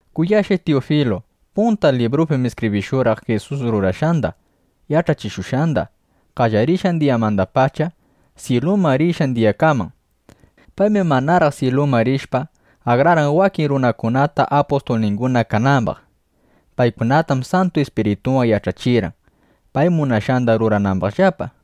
Kuyashqay Tiyufilu, punta libruypim iskibrishurqaq Jisus rurashqanda, yach'achikushqanda, qallarishqan diyamandapacha, syiluman rishqan diyakaman. Paymi manaraq syiluman rishpa, akrarqan wakin runakunata, apustulninguna kanambaq. Paykunatam Santu Ispiritunwan yach'achirqan, pay munashqanda ruranambaqllapa.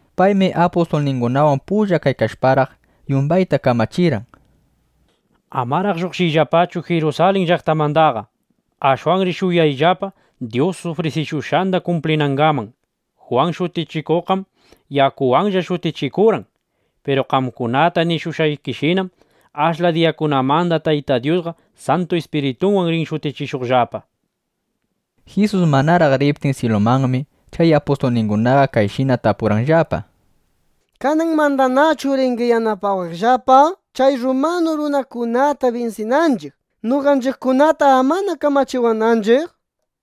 Paymi chay apustulningunawan pulla kaykashparaq, yumbayta kamachirqan: —Amaraq lluqshiyllapachu Jirusalin llaqtamandaqa. Ashwanri shuyayllapa, Dyus ufrisishushqanda kumplinangaman. Jwan Shutichikuqqam yakuwanlla shutichikurqan. Piru qamkunata nishushqayshinam, ashla diyakunamanda Tayta Dyusqa Santu Ispiritunwan rin shutichishuqllapa, nishpa. Jisus manaraq riptin syilumanmi, chay apustulningunaqa kayshina tapurqanllapa: —¿Kananmandanachu ringi yanapawaqllapa, chay rrumanu runakunata binsinanchiq, noqanchiqkunata amana kamachiwananchiq? nishpa.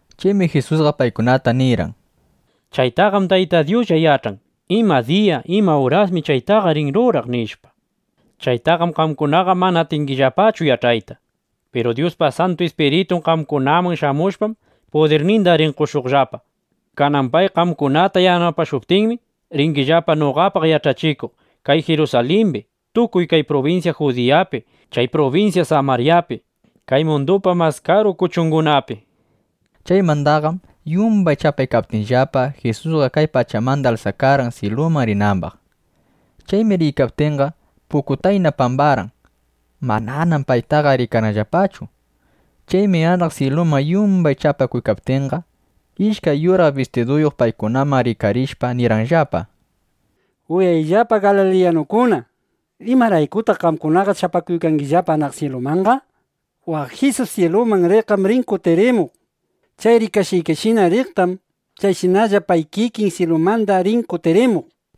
Chaymi Jisusqa paykunata nirqan: —Chaytaqam Taytay Dyuslla yach'an, ima diya, ima urasmi chaytaqa rin ruraq, nishpa. Chaytaqam qamkunaqa mana atingillapachu yach'ayta. Piru Dyuspa Santu Ispiritun qamkunaman shamushpam, pudirninda rin qoshuqllapa. Kanan pay qamkunata yanapashuptinmi, ringillapa noqapaq yach'achikuq kay Jirusalimbi, tukuy kay prubinsya Judiyapi, chay prubinsya Samaryapi, kay mundupa mas karu kuchungunapi, nishpa. Chaymandaqam yumbay chapaykaptinllapa, Jisusqa kay pachamanda alsakarqan, syiluman rinambaq. Chaymi riykaptinqa, pukutayna pambarqan. Mananam paytaqa rikarqanllapachu. Chaymi anaq syiluman yumbay chapakuykaptinqa, ishkay yuraq bistiduyuq paykunaman rikarishpa, nirqanllapa: —Uyayllapa, galiliyanukuna, ¿imaraykutaq qamkunaqa chapakuykangi anaq syilumanqa? Waq Jisus syiluman riqqam rin kutirimuq. Chay rikashqaykishina riqtam, chayshinalla pay kikin syilumanda rin kutirimuq, nishpa.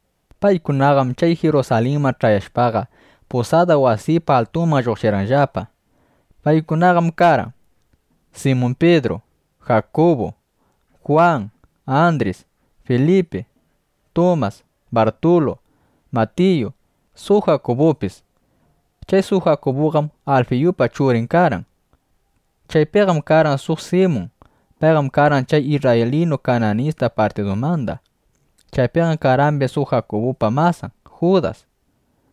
Paykunaqam chay Jirusalinman ch'ayashpaqa, pusada wasipa altunman lluqshirqanllapa. Paykunaqam karqan: Simun Pidru, Jakubu, Jwan, Andris, Filipi, Tumas, Bartulu, Matiyu, suq Jakubupis. Chay suq Jakubuqam Alfiyupa churin karqan. Chaypiqam karqan suq Simun. Payqam karqan chay isrraylinu Kananista partidumanda. Chaypiqam karqambis suq Jakubupa masan Judas.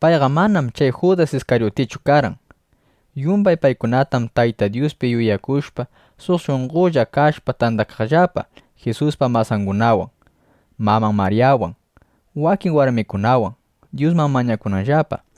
(Payqam manam chay Judas Iskaryutichu karqan.) Yumbay paykunam Tayta Dyuspi yuyakushpa, suq shunqolla kashpa, tandakaqllapa Jisuspa masangunawan, maman Maryawan, wakin warmikunawan, Dyusman mañakunanllapa.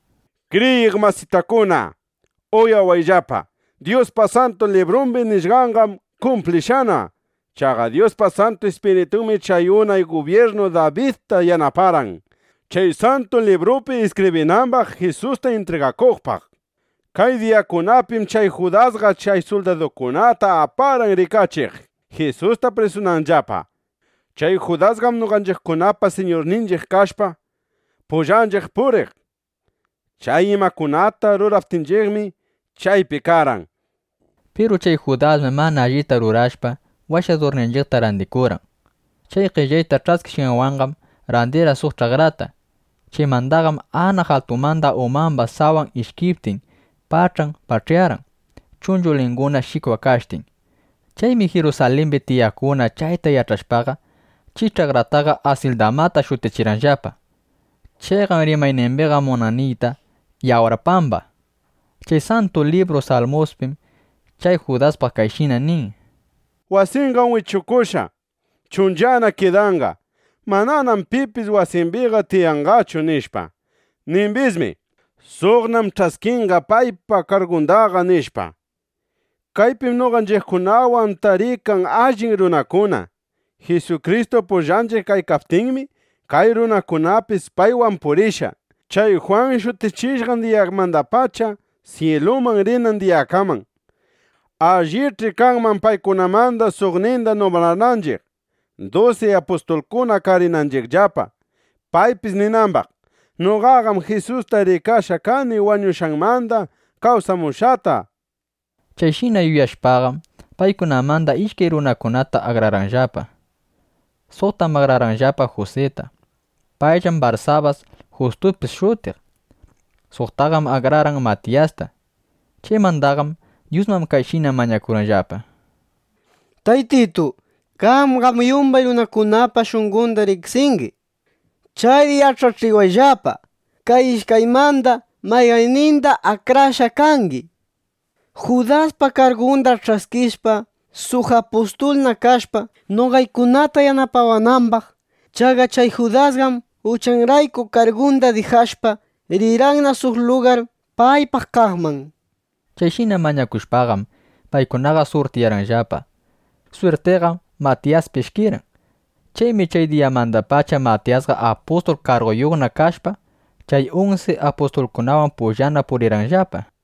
—Kriyiq masitakuna, uyawayllapa. Dyuspa Santu Librumbi nishqanqam kumplishqana. Chaqa Dyuspa Santu Ispiritunmi chay unay gubyirnu Dabidta yanaparqan, chay Santu Librupi iskibrinambaq Jisusta intrigakuqpaq. Kay diyakunapim chay Judasqa chay suldadukunata aparqan rikachiq, Jisusta prisunanllapa. Chay Judasqam noqanchiqkunapa suqninchiq kashpa, pullanchiq puriq. Chay imakunata ruraptinchiqmi, chaypi karqan. Piru chay Judasmi mana allita rurashpa, Washadurninchiqta randikurqan. Chay qellay ch'askishqanwanqam randirqan suq ch'akrata. Chaymandaqam anaq altumanda umamba sawan ishkiptin, pach'an pach'yarqan, chunchulinguna shikwakashtin. Chaymi Jirusalimbi tiyaqkuna chayta yach'ashpaqa, chay ch'akrataqa Asildamata shutichirqanllapa. Chayqam rimaynimbiqa munan niyta: “Yawar Pamba”. Chay Santu Libru Salmuspim chay Judaspaq kayshina nin: Wasinqam wichukushqa, chunchana kidanqa. Mananam pipis wasimbiqa tiyanqachu, nishpa. Nimbismi: Suqnam ch'askinqa paypa kargundaqa, nishpa. ’Kaypim noqanchiqkunawan tarikan allin runakuna. Jisukristu pullanchiq kaykaptinmi, kay runakunapis paywan purishqa, chay Jwan shutichishqan diyamandapacha syiluman rinan diyakaman. Allich'i kanman paykunamanda suqninda numbrananchiq, dusi apustulkuna karinanchiqllapa, paypis ninambaq: “Noqam Jisusta rikashqa kani wañushqanmanda kawsamushqata”, nishpa. Chayshina yuyashpaqam, paykunamanda ishkay runakunata akrarqanllapa. Suqtam akrarqanllapa Jusita. Payllam Barsabas, Justupis shutiq. Suqtaqam akrarqan Matiyasta. Chaymandaqam Dyusman kayshina mañakurqanllapa: —Taytitu, qamqam yumbay runakunapa shunqonda riqsingi. Chayri yach'achiwayllapa kay ishkaymanda mayqannindam akrashqa kangi, Judaspa kargunda ch'askishpa, suq apustulna kashpa, noqaykunata yanapawanambaq. Chaqa chay Judasqam, uchanrayku kargunda dijashpa, rirqanna suq lugar paypaq kaqman. Chayshina mañakushpaqam, paykunaqa surtiyarqanllapa. Swirtiqam Matiyaspi ishkirqan. Chaymi chay diyamandapacha Matiyasqa apustul karguyuqna kashpa, chay unsi apustulkunawan pullana purirqanllapa.